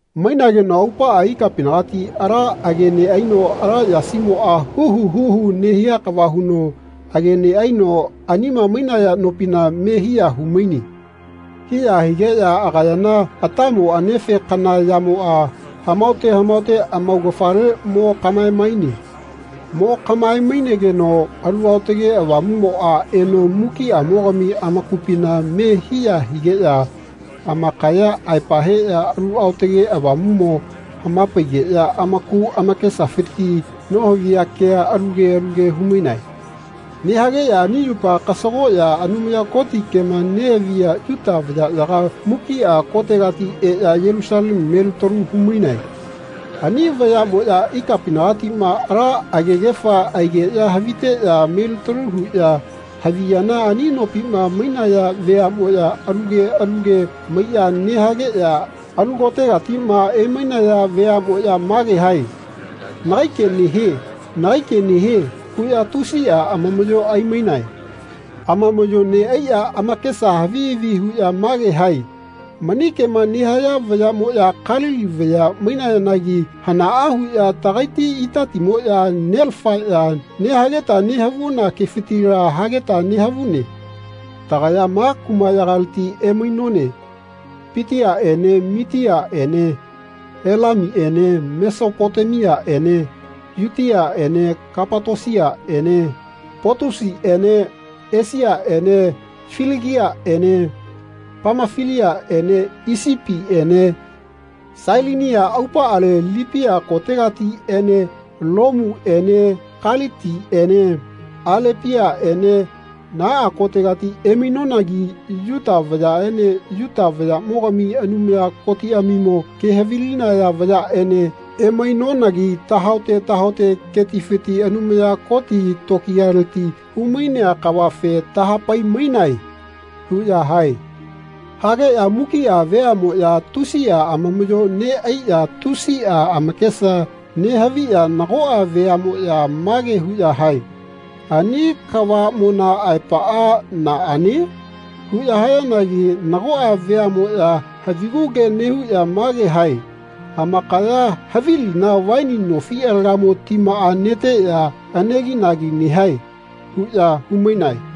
Mainageno aupaꞌa ikapinagati ala age neꞌaino ala yasimoꞌma huhu huhu nehia kava huno age neꞌaino anima mainaya nopina me hiya humaine. Hiya higeꞌya agayana atamo anefe kana yamoꞌa hamaote hamaote amaugafale mo kaꞌmaemaine. Mo kaꞌmae-mainegeno Alu Aotage Avamuꞌmoꞌa eno mukiꞌamogami amakupina me hiya higeꞌya amakaya aepa heꞌya Alu Aotage Avamuꞌmo hamapaigeꞌya amaku amakesafiti nohaviya kea alu ke alu ke humainae. Nehageꞌya ani yupa kasagoꞌya Anumaya Koti kema nehaviya Yuta vayaꞌyaga mukiꞌa kotegati eꞌya Yelusalemu melitalu humainae. Ani vayaꞌmoꞌya ikapinagatiꞌma ala agegefa aigeꞌya haviteꞌya melitalu huꞌya haviyana ani nopima mainaya veaꞌmoꞌya alu ke alu ke maiꞌya nehageꞌya alu kotegatiꞌma emainaya veaꞌmoꞌya mage hae “Nagai ke nehie. Nagai ke nehie.” huꞌya tusiꞌa amamaꞌyo aimainae. Amamaꞌyo neꞌaiꞌya amakesa havi havi huꞌya mage hae “Mani kema nehaya vayaꞌmoꞌya Kalili vaya mainayanagi hanaꞌa huꞌya tagaiti itatimoꞌya nelafaꞌya nehageta nehavuna kefitila hageta nehavune. Tagaya ma kumaꞌyagaleti emainone Patiaꞌene Mitiaꞌene Elamiene Mesopotemiaꞌene Yutiaꞌene Kapatosiene Potusiene Esiaꞌene Filigiaꞌene Pamafiliaꞌene Isipiene Sailinia aupaꞌale Lipia kotegatiꞌene Lomuene Kalitiene Alepiaꞌene naꞌa kotegati emainonagi Yuta vayaꞌene Yuta vayaꞌmogami Anumaya Kotiꞌamimo ke havilinaya vayaꞌene emainonagi tahaote tahaote ketifiti Anumaya Koti tokiyaleti humainea kavafe tahapai-mainae.” huꞌya hae. Hageꞌya mukiꞌa veaꞌmoꞌya tusiꞌa amamaꞌyo neꞌaiꞌya tusiꞌa amakesa nehaviꞌya nagoꞌa veaꞌmoꞌya mage huꞌya hae “Ani kavaꞌmona aepaꞌa naꞌane?” huꞌya hayanagi nagoꞌa veaꞌmoꞌya havigu ke nehuꞌya mage hae “Amakaya havilina vaini nofi alagamo timaꞌa neteꞌya aneginagi nehae.” huꞌya humainae.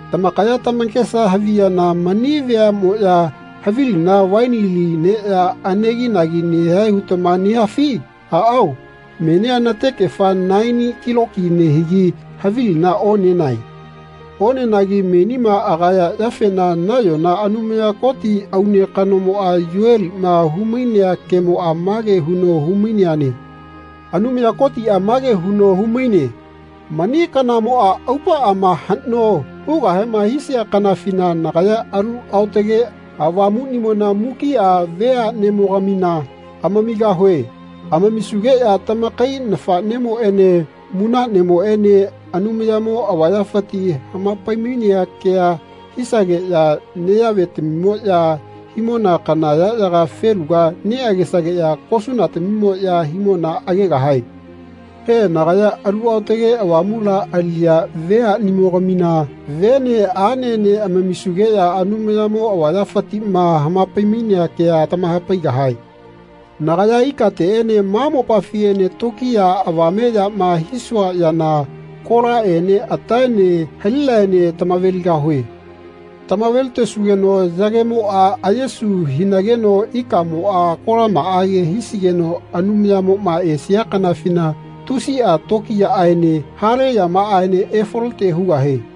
Tamakaya tamakesa haviyana mani veaꞌmoꞌya havilina vaini li neꞌya aneginagi nehae hutama nehafi? Aꞌao menia natekefa naeni kiloki nehigi havilina onenae. Onenagi menima agaya yafena nayona Anumaya Koti aune kanomoꞌa Yoeliꞌma humainea kemoꞌa mage huno humaineane. Anumaya Kotiꞌa mage huno humaine “Mani kanamoꞌa aupaꞌama haꞌno hugahema hisia kanafina nagaya Alu Aotage Avamuꞌnimona mukiꞌa veaꞌnemogamina amamigahue. Amamisugeꞌya tamakai nafaꞌnemoꞌene munaꞌnemoꞌene Anumayamo avayafiti hamapai-mainea kea hisageꞌya neyaꞌvetamimoꞌya himona kana yaꞌyaga feluga neꞌagesageꞌya kosunatamimoꞌya himona agegahae. He, nagaya Alu Aotage Avamula aliꞌya veaꞌnimogamina vene aꞌnene amamisugeꞌya Anumayamo avayafitiꞌma hamapai-mainea kea tamahapaigahae. Nagaya ikateꞌene ma mopafiꞌene tokiya avameꞌyama hisua yana kolaꞌene ataene halinaene tamaveligahue. Tamavelitesugeno yagemoꞌa ayesu hinageno ikaꞌmoꞌa kolamaꞌage hisigeno Anumayamoꞌma esia kanafina tusiꞌa tokiyaꞌaene hale yamaꞌaene efalote hugahie.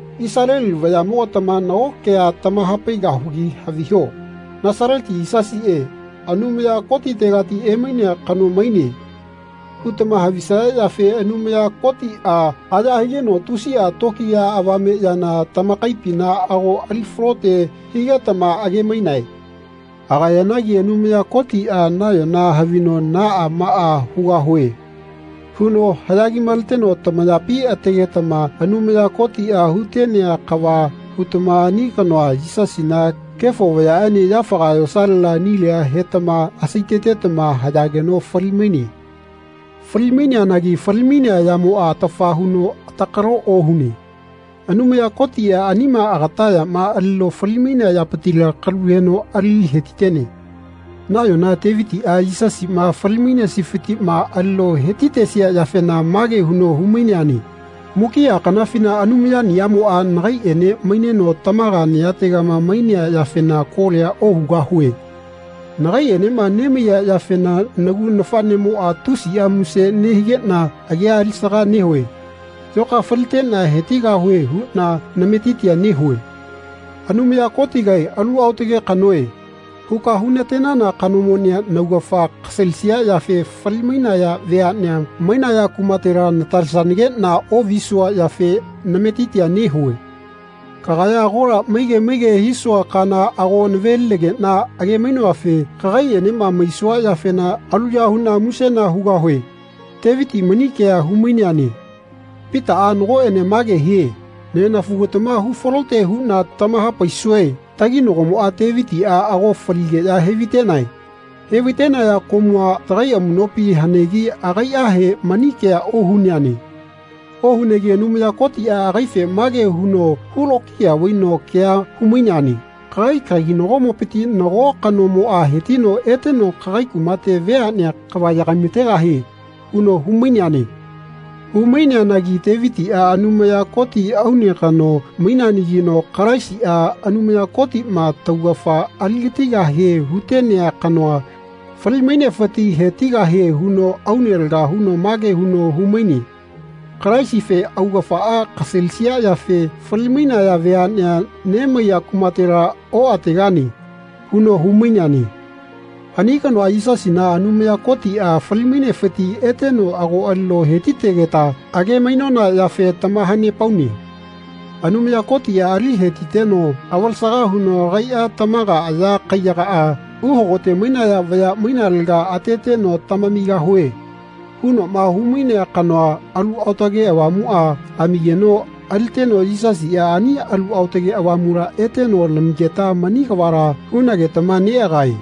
Isaleli vayaꞌmogatama nago kea tamahapaigahugi haviho “Nasaleti Yisasiꞌe, Anumaya Kotitegati emainea kano maine.” hutama havisaya yafe Anumaya Kotiꞌa aya higeno tusiꞌa tokiya avame yana tamakaipina ago ali falote higetama age-mainae. Agayanagi Anumaya Kotiꞌa nayona havino “Naꞌa maꞌa hugahue.” huno haꞌya kimaleteno tamayapi ategetama Anumaya Kotiꞌa hutenea kava hutama ani kanoa, Yisasina, kefo vayaꞌene yafaga yosalela nilia hetama asaitetama hayageno fali-maine. Falimaineanagi falimainea yamoꞌa atafa huno atakalo ohune. Anumaya Kotiꞌa anima agata yama alino falimainea yapitila kalu heno ali hetitene. Nayona Tevitiꞌa Yisasiꞌma falimainesifitiꞌma alino heti-tesia yafena mage huno humaineane “Mukiꞌa kanafina Anumayaniꞌamoꞌa nagaiꞌene maineno tamaga nayategama mainea yafena kolia ohugahue. Nagaiꞌenema nemaiya yafena nagu nafaꞌnemoꞌa tusiꞌa muse nehigeꞌna agia alisaga nehue. Yoka faliteꞌna hetigahue huꞌna nametitia nehue. Anumaya Kotigae ‘Alu aotage kanoe.’ huka hunatenana kanomonia naugafa kasalisia yafe fali-mainaya veaꞌne mainaya kumatela natalesanageꞌna oꞌvisua yafe nametitia nehue. Kagaya agola maige maige hisua kana ago navelinageꞌna age-mainoafe kagaiꞌenema maisua yafena aluya huꞌna musena hugahue.” Teviti mani kea humaineane. Pitaꞌa nagoꞌene mage hie “Nenafugatama hufalote huꞌna tamahapaisue taginagomoꞌa Tevitiꞌa ago faligeꞌya hevaitenae. Hevaitenaya komua tagai amuꞌnopi hanegi akaiꞌahe mani kea ohuneane. Ohunegi Anumaya Kotiꞌa agaife mage huno hulokiya vaino kea humaineane ‘Kagai kaginagomopiti nago kanomoꞌa hetino eteno kagai kumate veaꞌnea kava yagaimategahie.’ huno humaineane. Humaineanagi Tevitiꞌa Anumaya Koti aune kano maineanagino Kalaisiꞌa, Anumaya Kotiꞌma taugafa aligatigahe hutenea kanoa, fali-mainefiti hetigahie huno aune laga huno mage huno humaine. Kalaisife ‘Augafaꞌa kasalisia yafe fali-mainaya veaꞌne nemaiya kumatela oꞌategane.’ huno humaineane. Ani kanoa, Yisasina, Anumaya Kotiꞌa fali-mainefiti eteno ago alino hetitegeta age-mainona yafe tamahanepaune. Anumaya Kotiꞌa ali hetiteno avalesaga huno agaiꞌa tamaga aya kaiyagaꞌa uhagote mainaya vaya mainalega ateteno ‘Tamamigahue.’ hunoꞌma humainea kanoa, Alu Aotage Avamuꞌa, amigeno aliteno Yisasiꞌa ani Alu Aotage Avamula eteno lamigeta mani kavala hunagetama neꞌagae.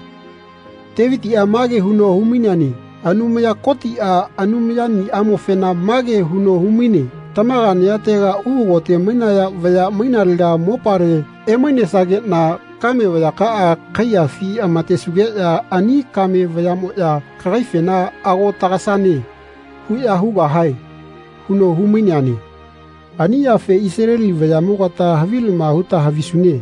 Tevitiꞌa mage huno humaineane Anumaya Kotiꞌa Anumayaniꞌamofena mage huno humaine ‘Tamaga nayatega uhagote mainaya vaya mainalega mopale emainesanageꞌna kame vayakaꞌa kaiyafi amatesugeꞌya ani kame vayaꞌmoꞌya kagaifena ago tagasane.’ huꞌya hugahae.” huno humaineane. “Ani yafe Isaleli vayaꞌmogata havilama huta havisune.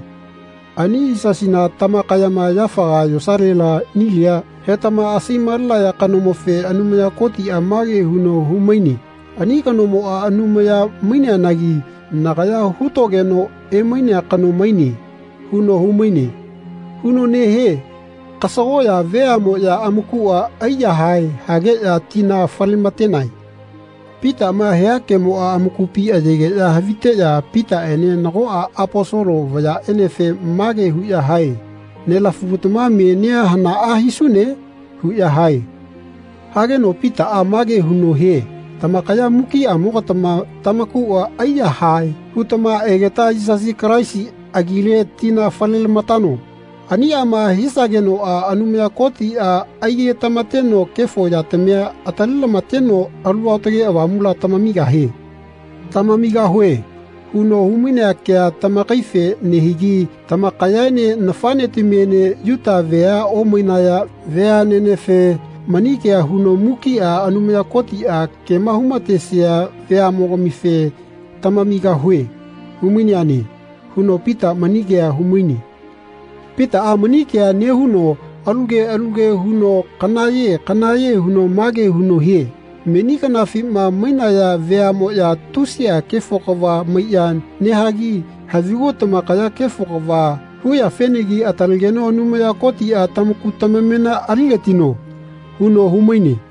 Ani Yisasina tamakayama yafaga yosalela nilia hetama asai-malenaya kanomofe Anumaya Kotiꞌa mage huno humaine ‘Ani kanomoꞌa Anumaya maineanagi nagaya hutogeno emainea kano maine.’ huno humaine.” huno nehie. Kasagoꞌya ve aꞌmoꞌya amakuꞌa aiyahae hageꞌya tina falematenae. Pitaꞌma hia kemoꞌa amakupi ayegeꞌya haviteꞌya Pitaꞌene nagoꞌa Aposolo vayaꞌenefe mage huꞌya hae “Nelafugatama menia hanaꞌa hisune?” huꞌya hae. Hageno Pitaꞌa mage huno hie “Tamakaya mukiꞌamogatama tamakuꞌa aiyahae hutama egeta Yisasi Kalaisi agile tina falelamatano. Aniꞌama hisagenoꞌa Anumaya Kotiꞌa aigetamateno kefo yatamia atalelamateno Alu Aotage Avamula tamamigahie. ‘Tamamigahue.’ huno humainea kea tamakaife nehigi tamakayaene nafaꞌnetamiene Yuta vea omainaya veaꞌnenefe mani kea huno mukiꞌa Anumaya Kotiꞌa kema humatesia veaꞌmogamife ‘Tamamigahue.’ humaineane.” huno Pita mani kea humaine. Pitaꞌa mani kea nehuno alu ke alu ke huno kanaꞌye kanaꞌye huno mage huno hie “Meni kanafima mainaya veaꞌmoꞌya tusiꞌa kefo kava maiꞌya nehagi havigu tamakaya kefo kava huyafenagi atalegeno Anumaya Kotiꞌa tamaku tamamena aligatino.” huno humaine.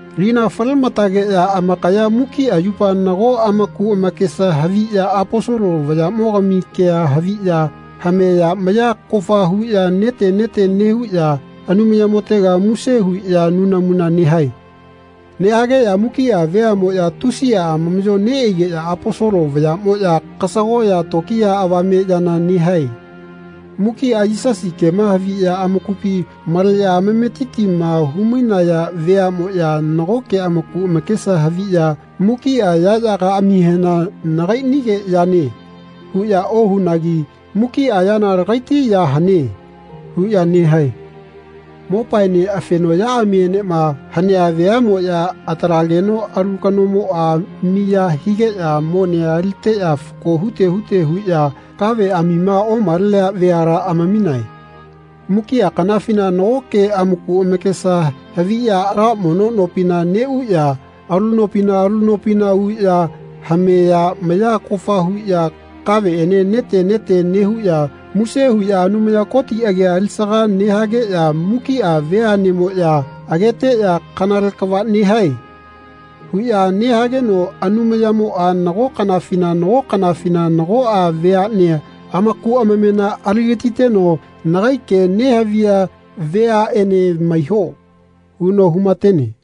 Lina falematageꞌya amakaya mukiꞌa yupa nago amaku amakesa haviꞌya Aposolo vayaꞌmogami kea haviꞌya hameꞌya maya kofa huꞌya nete nete nehuꞌya Anumayamotega muse huꞌya nunamuna nehae. Nehageꞌya mukiꞌa veaꞌmoꞌya tusiꞌa amamaꞌyo neꞌaigeꞌya Aposolo vayaꞌmoꞌya kasagoꞌya tokiya avame yana nehae. Mukiꞌa Yisasi kema haviꞌya amakupi maleꞌya amametitima humainaya veaꞌmoꞌya nagoke amaku amakesa haviꞌya mukiꞌa yaꞌyagaꞌamihena “Nagaiꞌnige yane.” huꞌya ohunagi “Mukiꞌa yana lagaiti ya hane.” huꞌya nehae. Mopaene afenoꞌyaꞌamienema hanea veaꞌmoꞌya atalageno alu kanomoꞌa miya higeꞌya monea aliteꞌya fako hute hute huꞌya kaveꞌamima omalenea veala amaminae. Mukiꞌa kanafina nagoke amaku amakesa haviꞌya ala mono nopina neꞌuꞌya alu nopina alu nopina uꞌya hameꞌya maya kofa huꞌya kaveꞌene nete nete nehuꞌya muse huꞌya Anumaya Koti agia alisaga nehageꞌya mukiꞌa veaꞌnemoꞌya ageteꞌya “Kanale kava nehae.” huꞌya nehageno Anumayamoꞌa nago kanafina nago kanafina nagoꞌa veaꞌnea amaku amamena aligatiteno “Nagai ke nehaviya veaꞌene maiho.” huno humatene.